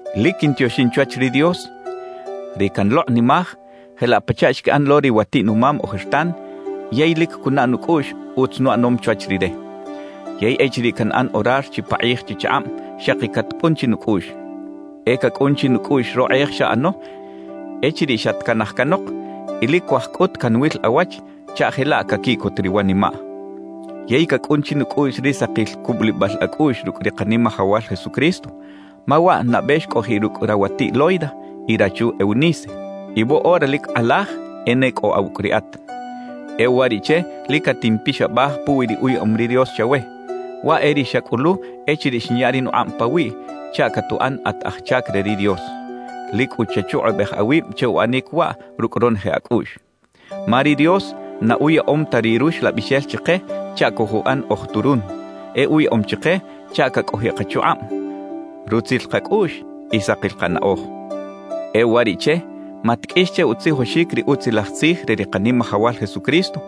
Lic quintioxin chwach ri Dios, ri canlokꞌnimaj jelaꞌ pachaꞌ xquiꞌan lo ri watiꞌ-numam ojertan yey lic cunaꞌ nucꞌuꞌx utz nuꞌanom chwach Rire. Yey echiriꞌ canꞌan orar chipakꞌij chichakꞌab xaki catcꞌun chinucꞌuꞌx. E cacꞌun chinucꞌuꞌx rokꞌej xaꞌano echiriꞌ xatcanaj canok y lic cuaj cꞌut canwil awach chaꞌ jelaꞌ caquiꞌcot ri wanimaꞌ. Yey cacꞌun chinucꞌuꞌx ri sakil cubulibal acꞌuꞌx rucꞌ ri Kanimajawal Jesucristo; ma waꞌ nabe xcꞌojiꞌ rucꞌ rawatiꞌ Loida y rachu Eunice, y woꞌora lic kꞌalaj e ne cꞌo awucꞌ riꞌat. E uwariꞌche lic catimpixabaj puwi ri uyaꞌom ri Dios chawe, waꞌ e ri xacꞌulu echiriꞌ xinya ri nukꞌab pawiꞌ chaꞌ catuꞌan at aj chac re ri Dios. Lic cꞌu chachukꞌubej awib che uꞌanic waꞌ rucꞌ ronoje acꞌuꞌx. Ma ri Dios na uyaꞌom ta ri Ruxlabixel chike chaꞌ cojuꞌan oj turun; e uyaꞌom chike chaꞌ cacꞌojiꞌ kachukꞌab, rutzil kacꞌuꞌx y sakil kanaꞌoj. E uwariꞌche, matqꞌuix che utzijoxic ri Utzilaj Tzij re ri Kanimajawal Jesucristo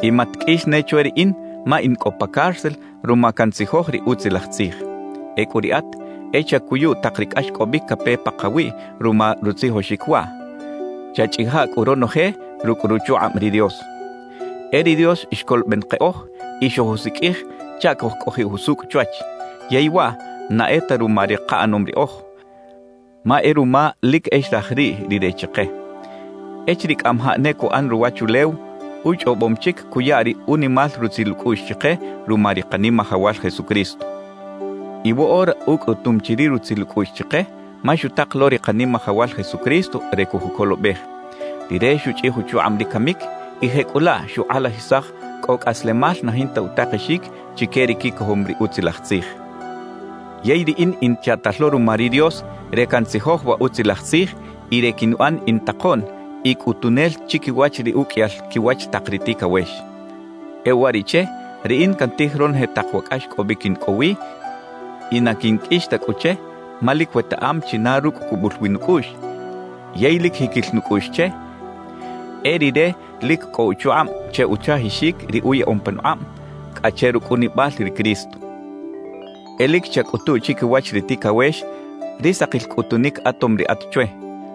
y matqꞌuix ne chwe riꞌin ma in cꞌo pa cárcel ruma cantzijoj ri Utzilaj Tzij. Ecꞌu riꞌat, e chacuyu tak ri cꞌaxcꞌobic cape pakawiꞌ ruma rutzijoxic waꞌ, chachꞌija cꞌu ronoje rucꞌ ruchukꞌab ri Dios. E ri Dios xcoloben keꞌoj y xojusiqꞌuij chaꞌ cojcꞌojiꞌ jusucꞌ chwach; yey waꞌ na e ta ruma ri kaꞌanom riꞌoj, ma e ruma lic e xraj riꞌ Rire chike. Echiriꞌ cꞌamajaꞌ ne cuꞌan ruwachulew, uchꞌobom chic cuya ri unimal rutzil ucꞌuꞌx chike ruma ri Kanimajawal Jesucristo. Y woꞌora ucꞌutum chi ri rutzil ucꞌuꞌx chike ma xutak lo ri Kanimajawal Jesucristo re cojucolobej. Rire xuchꞌij uchukꞌab ri camic y jecꞌulaꞌ xukꞌalajisaj cꞌo cꞌaslemal na jinta utakexic chique ri quicojom ri Utzilaj Tzij. Yey riꞌin in chaꞌtal lo ruma ri Dios re cantzijoj wa Utzilaj Tzij y re quinuꞌan in takoꞌn y cꞌutunel chiquiwach ri uqꞌuiyal quiwach tak ri ticawex. E uwariꞌche riꞌin cantij ronoje tak wa cꞌaxcꞌobic in cꞌo wi y na quinqꞌuix ta cꞌu che, ma lic wetaꞌam china rucꞌ cubul wi nucꞌuꞌx, yey lic jiquil nucꞌuꞌx che e Rire lic cꞌo uchukꞌab che uchajixic ri uyaꞌom panukꞌab cꞌa che rucꞌunibal ri Cristo. E lic chacꞌutu chiquiwach ri ticawex ri sakil cꞌutunic atom riꞌat chwe;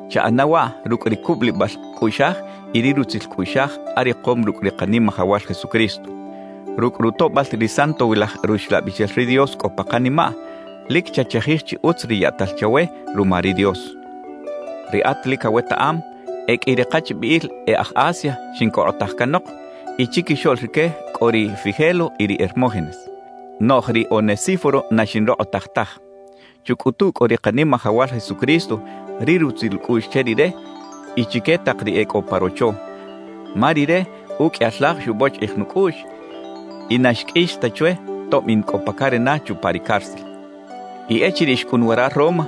chaꞌana waꞌ rucꞌ ri cubulibal cꞌuꞌxaj y ri rutzil cꞌuꞌxaj arikom rucꞌ ri Kanimajawal Jesucristo. Rucꞌ rutoꞌbal ri Santowilaj Ruxlabixel ri Dios cꞌo pa kanimaꞌ, lic chachajij chi utz ri yaꞌtal chawe ruma ri Dios. Riꞌat lic awetaꞌam, e qꞌui ri kachbiꞌil e aj Asia xincokꞌotaj canok, y chiquixoꞌl rique cꞌo ri Figelo y ri Hermógenes. Noꞌj ri Onesíforo na xinrokꞌotaj taj. Chucꞌutu cꞌu ri Kanimajawal Jesucristo ri rutzil ucꞌuꞌx che rire y chique tak ri e cꞌo pa rocho, ma rire uqꞌuiyal laj xubochiꞌij nucꞌuꞌx y na xqꞌuix ta chwe tob in cꞌo pa carena chupa ri cárcel. Y echiriꞌ xcꞌun wara Roma,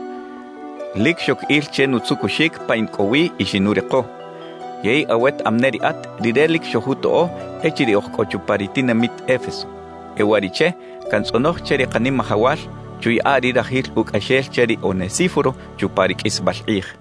lic xoc il che nutzucuxic pa in cꞌo wi y xinuriko. Yey awetaꞌam ne riꞌat, rire lic xojutoꞌo echiriꞌ oj cꞌo chupa ri tinamit Éfeso. E uwariꞌche cantzꞌonoj che ri Kanimajawal chuyaꞌa ri rajil ucꞌaxel che ri Onesíforo chupa ri qꞌuisbal kꞌij.